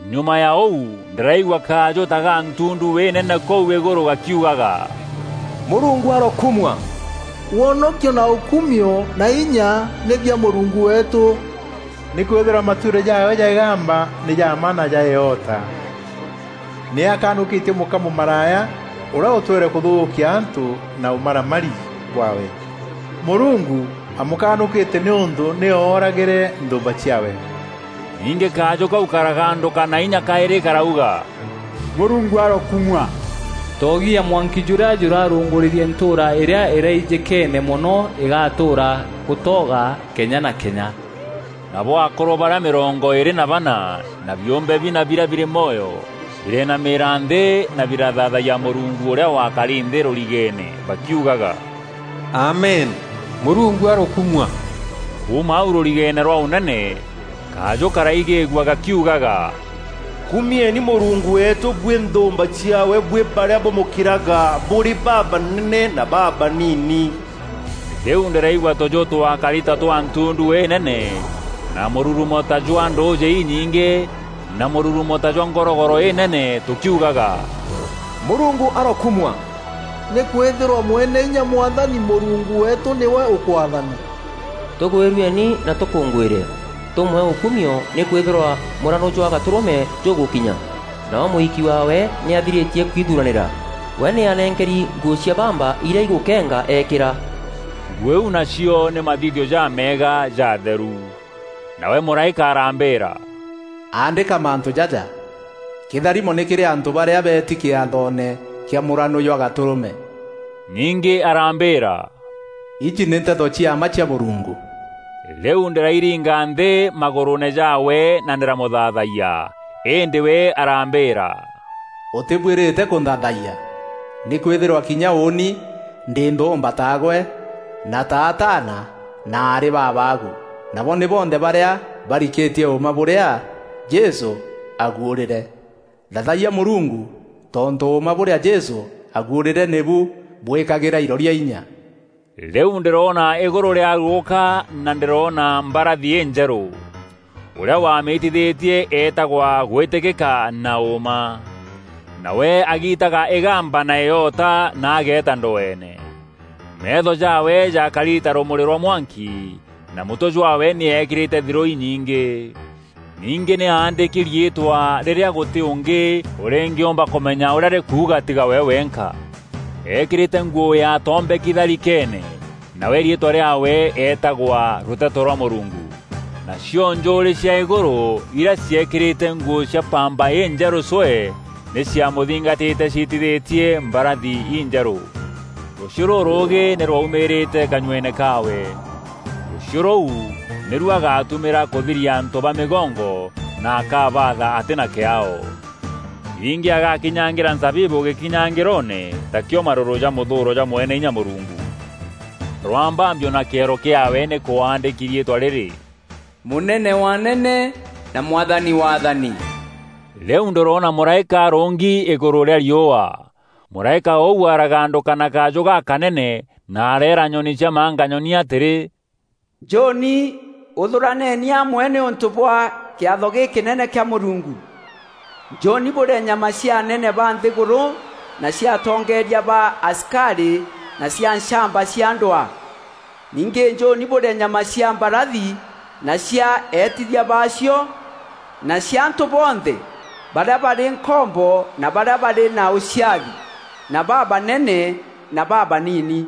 Nyuma ya ûu ndîraigua kajû ta ga ntundu înene kûu îgûrû gakiugaga, “Mûrungu arokumua! Wonokio na ûkumio na inya nî bia Mûrungu weetû, nîkwîthîrwa matuîro jaawe ja îgamba nî ja mma na ja îota. Nî akanûkîtie mûka mûmaraya ûrîa ûtwîre kûthûkia antû na ûmaramari bwaawe. Mûrungu amûkanûkîtie nîûntû nî ooragîre nthûûmba ciaawe.” Ningî kajû kau karagandûka na inya kaîrî karauga, “Mûrungu arokumua! Toogi ya mwanki jûrîa jûrarûngûrîrie ntûûra îrîa îraijîkeene mono îgatûûra gûtooga kenya na kenya.” Nabo akûrû barîa mîrongo îîrî na bana na biûmbe bina biria birî mwoyo birenamîîria nthî na birathaathayia Mûrungu ûrîa wakari nthî rûrigeene bakiugaga, “Amen! Mûrungu arokumua!” Kuuma au rûrigeene rwa ûnene, kajû karaigîîgua gakiugaga, “Kumieni Mûrungu weetû buî nthûûmba ciaawe buî barîa bûmûkîraga, bûrî babanene na babanini.” Rîu ndîraigua tûjû twakari ta twa ntundu înene na mûrurumo ta jwa ndûûjî inyingî na mûrurumo ta jwa ngorogoro înene, tûkiugaga, “Mûrungu arokumua! Nîkwîthîrwa Mweneinya Mwathani Mûrungu weetû nîwe ûkwaathana! Tûgwîrueni na tûkûngwîre; tûmwee ûkumio nîkwîthîrwa mûranû jwa Gatûrûme jûgûkinya, nawe mûiki waawe nî athirîtie kwithuranîra. We nî anenkeri nguû cia bamba irîa igûkenga eekîra.” Nguû iu nacio nî mathithio jameega ja atheru. Nawe mûraîka arambîîra, “Aandîka mantû jaja: Kîtharimo nî kîrî antû barîa beeti kîathoone kîa mûranû jwa Gatûrûme.” Ningî arambîîra, “Iji nî nteto cia mma cia Mûrungu,” Rîu ndîrairinga nthî magûrûûne jaawe na ndîramûthaathayia. Îndî we arambîîra, “Ûtîbuîrîte kûnthaathayia! Nîkwîthîrwa kinya ûûni ndî nthûûmba taagwe na ta ataana na aarî ba abaagu, nabo nî bonthe barîa barikîtie ûûma bûrîa Jesû aaguûrîîre. Thaathayia Mûrungu! Tontû ûûma bûrîa Jesû aaguûrîre nîbu bwîkagîra iroria inya.” Rîu ndîroona îgûrû rîarugûka na ndîroona mbarathi înjerû! Ûrîa wamîtithîtie eetagwa Gwîtîkîka na Ûûma. Nawe agiitaga îgamba na îota na ageeta ndweene. Meetho jaawe jaakari ta rûmûrî rwa mwanki na mûtwe jaawe nî ekîrîte thirû inyingî. Ningî nî aandîki riîtwa rîrîa gûtî ûngî ûrîngîûmba kûmenya ûrîa rîkuuga tiga we wenka. Eekîrîte nguû yaatombeki tharikeene, nawe riîtwa rîaawe eetagwa “Rûteto rwa Mûrungu.” Nacio njûûrî cia îgûrû irîa ciekîrîte nguû cia bamba injerû cwee nî ciamûthingatîte ciîtithîtie mbarathi injerû. Rûchiû rûrûûgî nî rwaumîrîte kanyueene kaawe. Rûchiû rûu nîru agatumîra kûthiria antû ba mîgongo na akabaatha atî na kîaao. Ningî agakinyangîra nzabibû gîkinyangîroone takîo marûrû ja mûthûûro jwa Mweneinya Mûrungu. Rwambambio na kîero kîaawe nî kwaandîki riîtwa rîrî, “Mûnene wa anene na Mwathani wa athani.” Rîu ndîroona mûraîka arûngi îgûrû rîa riûa. Mûraîka ûu aragandûka na kajû gakanene na areera nyoni cia manganyoni atîrî, “Njûûni! Ûthûraneni amwe nîûntû bwa kîatho gîkînene kîa Mûrungu. Njûûni bûrîe nyama cia anene ba nthîgûrû na cia atongeeria ba asikarî na cia nchamba cia ndwaa. Ningî njûûni bûrîe nyama cia mbarathi na cia eetithia baacio na cia antû bonthe; barîa barî nkombo na barîa barî na ûciathi, na babanene na babanini!”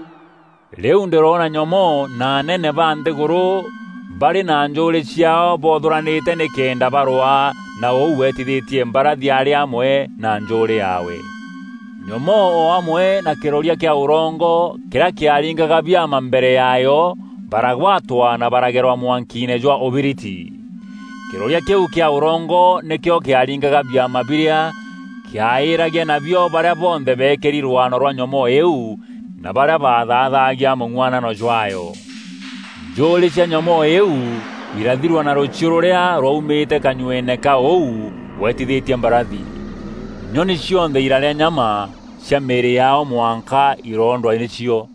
Rîu ndîrona nyomoo na anene ba nthîgûrû barî na njûûrî ciaao boothûranîte nîkenda barwaa na ûu weetithîtie mbarathi arî amwe na njûûrî yaawe. Nyomoo o amwe na kîroria kîa ûrongo kîrîa kîaringaga biama mbere yaayo baragwatwa na baragerwa mwankiine jwa ûbiriti. Kîroria kîu kîa ûrongo nîkîo kîaringaga biama birîa kîaîîragia nabio barîa bonthe beekîri rwaano rwa nyomoo îîu na barîa bathaathagia mûng'uanano jwaayo. Njûûrî cia nyomoo îîu irathirua na rûchiû rûrîa rwaumîrîte kanyueene ka ûu weetithîtie mbarathi. Nyoni cionthe irarîa nyama cia mîîrî yaao mwanka iroondwa nîcio.